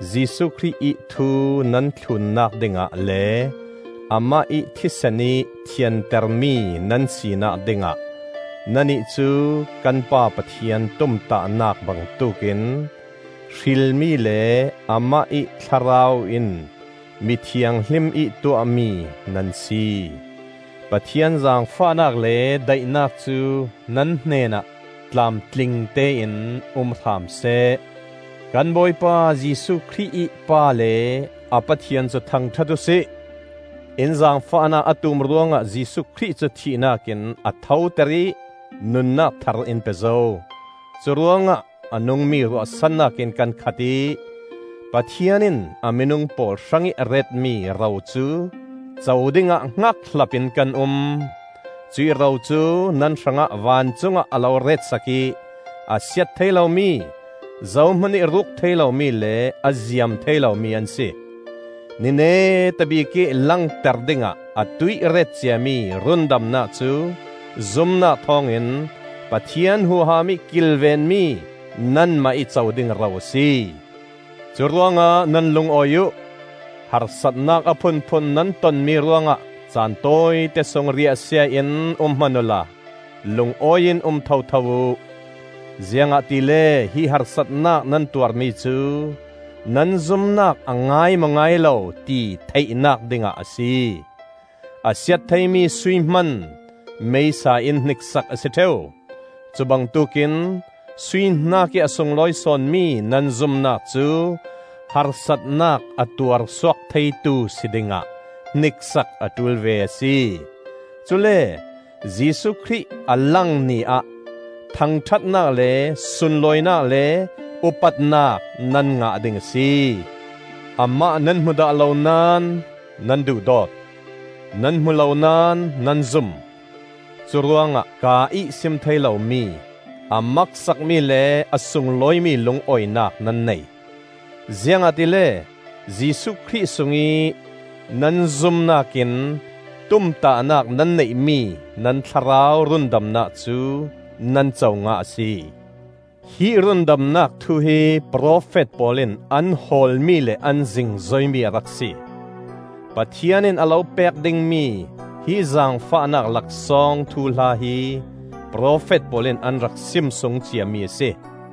Jesuh Khrih ih thu nan thlunnak dingah le amah ih thisen ih thiantermi nan sinak dingah nannih cu kan Pa Pathian tumtahnak bangtuk in hrilmi le amah ih Thlarau in mi thianghlim ih tuahmi nan si. Pathian zaangfahnak le daihnak cu nan hnenah tlamtlingte in um hram seh. Kan Bawipa Jesuh Khrih ih Pa le a Pathian cu thangṭhat uhsi. In zaangfahnak a tum ruangah Jesuh Khrih cu thihnak in a thoter ih nunnak thar in pe zo. Cu ruangah a nungmi ruahsannak in kan khat ih, Pathian in a minung pawl hrangih a retmi ro cu co dingah hngakhlap in kan um. Cuih ro cu nan hrangah vancungah a lo ret sak ih a siat thei lomi, zohmanih ruk thei lomi le a ziam thei lomi an si. Ni neta bikih langter dingah atuih ret ciami rundamnak cu zumnak thawngin Pathian huham ih kilvenmi nanmah ih co ding ro a si. Curuangah nan lungawi uh! Harsatnak a phunphun nan tonmi ruangah caan tawite sung riahsia in um hman uhla lungawi in um thotho uh! Ziangahtile hi harsatnak nan tuarmi cu nan zumnak a ngai maw ngai lo ti theihnak dingah a si. A siat theimi sui hman meisa in hniksak a si ṭheu. Cu bangtuk in sui hnakih a sunglawi sawnmi nan zumnak cu harsatnak a tuar suak theitu si dingah hniksak a ṭul ve a si. Cule Jesuh Khrih a lang Ni ah thangṭhatnak le sunlawinak le upatnak nan ngah ding a si. Amah nan hmu dah lo naón nan duhdawt; nan hmu lo naón nan zum. Curuangah kaa ih sim thei lomi, a maksakmi le a sunglawimi lungawinak nan nei. Ziangahtile Jesuh Khrih sungih nan zumnak in tumtahnak nan neihmi nan thlarau rundamnak cu nan co ngah a si. Hi rundamnak thu hi profet pawl in an hawlmi le an zingzoimi a rak si; Pathian in a lo pek dingmi hi zaangfahnak laksawng thuhla hi profet pawl in an rak sim sung ciami a si.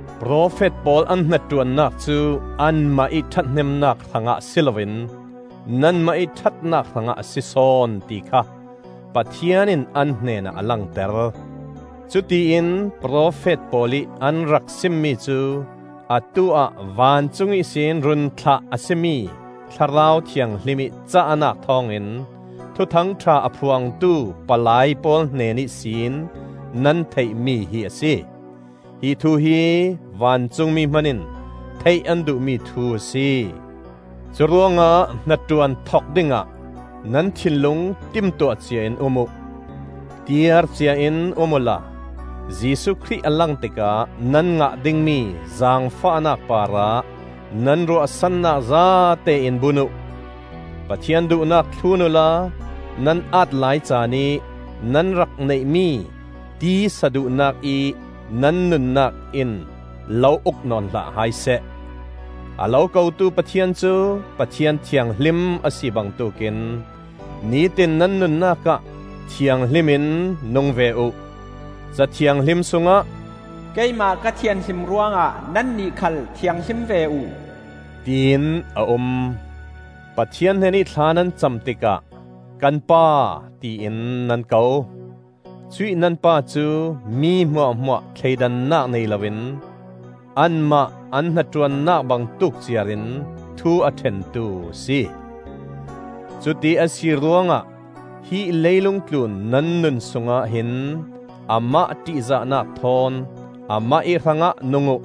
Profet pawl an hnaṭuannak cu anmah ih ṭhathnemnak hrangah si loin nanmah ih ṭhatnak hrangah a si sawn ti kha Pathian in an hnenah a langter. Cutiin profet pawl ih an rak simmi cu atu-ah vancung ihsin run thlah a si mi Thlarau Thianghlim ih cahnak thawngin Thuthang ṭha a phuangtu palai pawl hnen ihsin nan theihmi hi a si. Hi thu hi vancungmi hmanin theih an duhmi thu a si. Curuangah hnaṭuan thok dingah nan thinlung timtuah ciain um uh. Tiar ciain um uhla Jesuh Khrih a lang tikah nan ngah dingmi zaangfahnak parah nan ruahsannak zatein bun uh. Pathian duhnak thlun uhla nan aat lai caanih nan rak neihmi tisa duhnakih nan nunnak in lo uk nawn hlah hai seh. A lo ko tu Pathian cu Pathian thianghlim a si bangtuk in nitin nan nunnak ah thianghlim in nung ve uh. Ca Thianghlim sungah, “Keimah ka thianhlim ruangah nannih khal thianghlim ve uh,” tiin a um. Pathian hnenih thla nan cam tikah kan Pa tiin nan ko. Cuih nan Pa cu mi hmuahhmuah thleidannak nei loin anmah an hnaṭuannak bangtuk ciarin thu a ṭhentu a si. Cuti a si ruangah hi leilung tlun nan nun sungah hin amah ṭihzahnak thawn amah ih hrangah nung uh.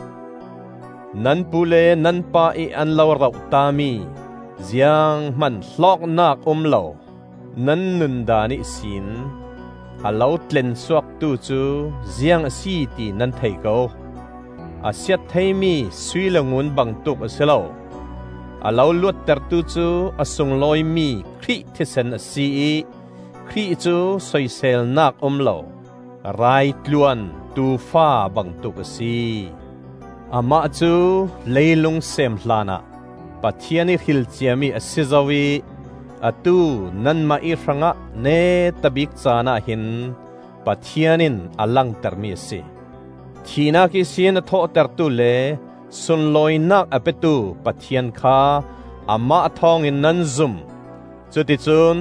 Nan pu le nan pa ih an lo roh tami zianghman hlawknak um lo nan nundaan ihsin a lo tlensuaktu cu ziang a si ti nan thei ko. A siat theimi sui le ngun bangtuk a si lo. A lo luattertu cu a sunglawimi Khrih thisen a si ih Khrih cu soiselnak um lo raitluan tuufa bangtuk a si. Amah cu leilung seem hlanah Pathian ih hrilcia mi a si zo ih atu nanmah ih hrangah neta bik caanah hin Pathian in a langtermi a si. Thihnak ihsin a thawhtertu le sunlawinak a petu Pathian kha Amah thawngin nan zum. Cuti cun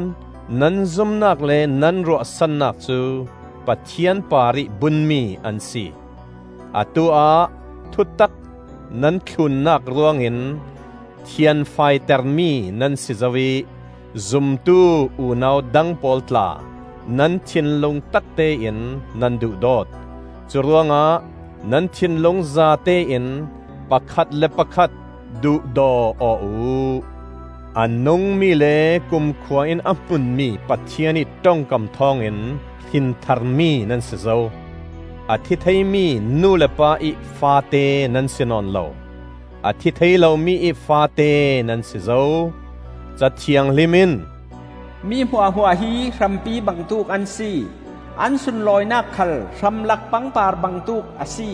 nan zumnak le nan ruahsannak cu Pathian parih bunmi an si. Atu-ah thutak nan thlunnak ruangin thianfaitermi nan si zo ih zumtu unau dang pawl tla nan thinlung taktein nan duhdawt. Curuangah nan thinlung zatein pakhat le pakhat duhdaw aw uh. A nungmi le kumkhua in a hmunmi Pathian ih ṭongkam thawngin hrintharmi nan si zo; a thi theimi nu le pa-ih faate nan si nawn lo, a thi thei lomi ih faate nan si zo. Ca Thianghlim in, “Mi hmuahhmuah hi hrampi bangtuk an si; An sunlawinak khal hramlak pangpar bangtuk a si.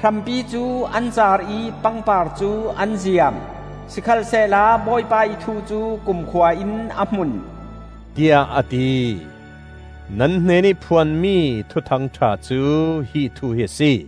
Hrampi cu an caar ih pangpar cu an ziam, Sikhalsehla Bawipa ih thu cu kumkhua in a hmun,” tiah a ti. Nan hnenih phuanmi Thuthang ṭha cu hi thu hi a si.